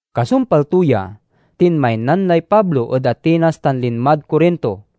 Kasumpal to ya, tinmaynan lay Pablo ed Atenas tan linmad Corinto.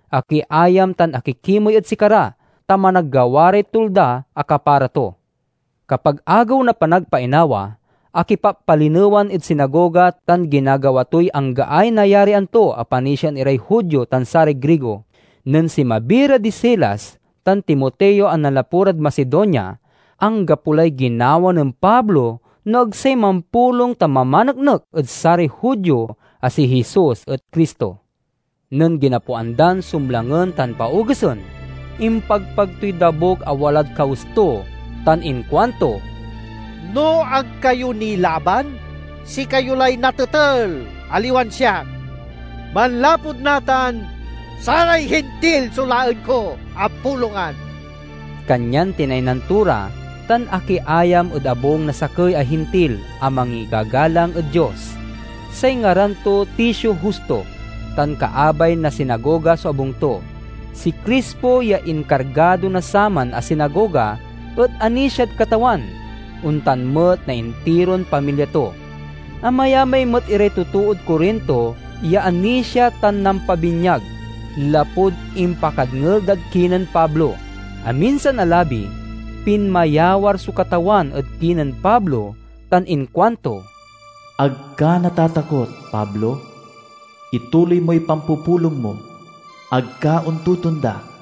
Akiayam tan akikimey ed sikara, ta managgawa ray tulda a kapara to. Kapag Agew na Panagpainawa, akipappalinewan ed sinagoga, tan ginagawa toy anggaay nayarian to a panisiaen iray Judio tan saray Grigo. Nen sinmabi ra di Silas tan Timoteo a nanlapu rad Macedonia, anggapo lay ginawa nen Pablo no ag say mampulong tan mamaneknek ed saray Judio a si Jesus et Cristo. Nen ginapoan dan sumlangen tan paogesen, impagpag toy dabuk a walad kawes to tan inkuanto, "No ag kayo nilaban, sikayo lay natetel, aliwan siak! Manlapud natan, saray Hintil so laen ko a pulongan." Kanyan tinaynan to ra, tan akiayam ed abung na sakey a Hintil a mangigagalang ed Dios. Say ngaran to Ticio Justo, tan kaabay na sinagoga so abung to. Si Crispo, ya inkargado na saman a sinagoga, et anisiad Katawan; ontan met na intiron pamilya to. Amayamay met iray totood Corinto ya anisia tan nampabinyag, lapud impakadngel dad kinen Pablo. Aminsan a labi, pinmayawar so Katawan ed kinen Pablo tan inkuanto, "Ag ka natatakot, Pablo! Ituloy moy pampupulong mo. Ag ka ontotonda,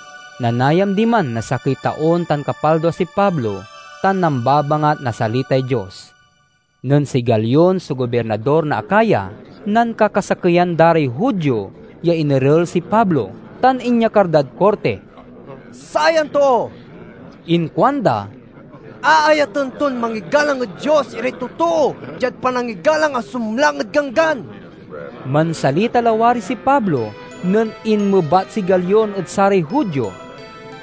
Nanayam diman na sakey taon tan kapaldua si Pablo tan nambabangat na salitay Dios. Nen si Galion so gobirnador na Acaya, nankakasakeyan da ray Judio ya inerel si Pablo tan inyakar dad korti. "Sayan too," inkuanda, "aayaten ton mangigalang ed Dios iray totoo diad panangigalang a sumlang ed ganggan." Mansalita lawari si Pablo nen inmebat si Galion ed saray Judio,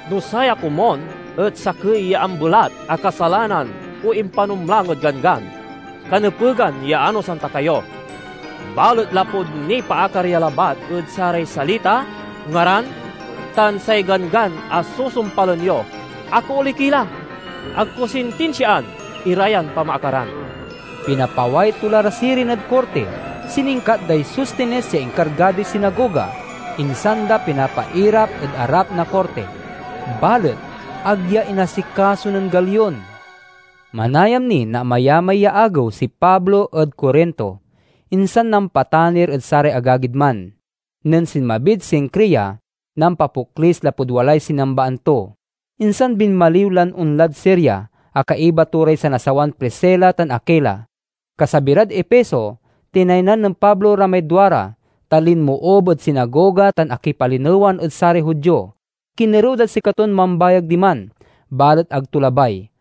"No saya komun et sakey ya ambelat a kasalanan o impanumlang ed ganggan, kanepegan ya anosan ta kayo. Balet lapud nipaakar ya labat ed saray salita, ngaran, tan say ganggan a susumpalen yo, akaoley ki la. Ag ko sintinsiaan ira yan pamaakaran!" Pinapaway to la ra sirin ed korti. Siningkat day Sostenes ya inkargadoy sinagoga, insan da pinapairap ed arap na korti. Balet ag ya inasikaso nen Galion. Manayam ni na amayamay ya agew si Pablo ed Corinto, insan nampatanir ed saray agagid man. Nen sinmabid Cencrea, nampapoklis lapud walay sinambaan to. Insan binmaliw lan onlad Siria, a kaiba to ray sanasawan Priscila tan Aquila. Kasabi rad Efeso, tinaynan nen Pablo ra may duara, ta linmoob ed sinagoga tan akipalinewan ed saray Judio. Kinerew dad sikaton mambayag diman, balet ag to labay.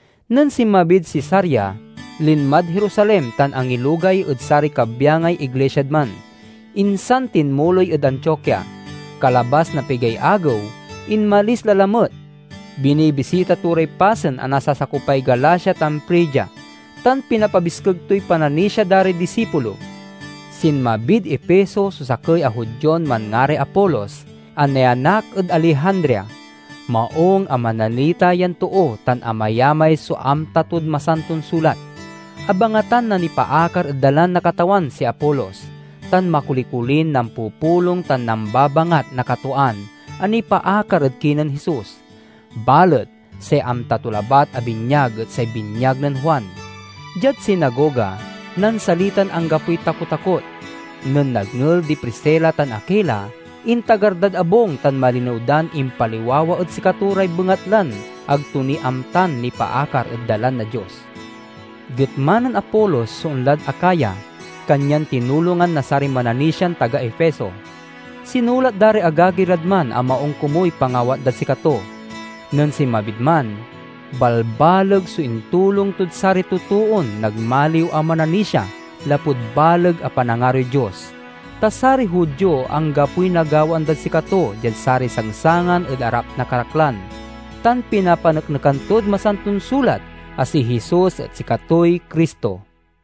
Nen sinmabid Cesarea, linmad Jerusalem tan angilugay ed saray kabyangay iglisiad man, insan tinmuloy ed Antiokia. Kalabas na pigay agew, inmalis la lamet. Binibisita to ray pasen a nasasakopay Galacia tan Frigia, tan pinapabiskeg toy pananisia da ray disipulo. Sinmabid Efeso so sakey a Judion manngaray Apolos, a nianak ed Alejandria. Maung a manalita yan too tan amayamay so amta tod Masanton Sulat. Abangatan na nipaakar ed Dalan na Katawan si Apolos, tan makoli-kolin nampupulong tan nambabangat na katwaan a nipaakar ed kinen Jesus. Balet say amta to labat a binyag et say binyag nen Juan. Diad sinagoga, nansalitan anggapoy takotakot. Nen nadngel di Priscila tan Aquila, intagar dad abung tan malinew dan impaliwawa ed sikato ray bengatlan ag to ni amtan nipaakar ed Dalan na Dios. Getma nen Apolos so onlad Acaya, kanyan tinulongan na saray mananisian taga Efeso. Sinulat da ray agagi rad man a maung komuy pangawat dad sikato. Nen sinmabid man, balbaleg so intulong tod saray totoon nagmaliw a mananisia lapud baleg a panangaroy Dios. Ta saray Judio anggapoy nagawaan dad sikato diad saray sangsangan ed arap na karaklan, tan pinapaneknekan tod Masanton Sulat a si Jesus et sikatoy Cristo.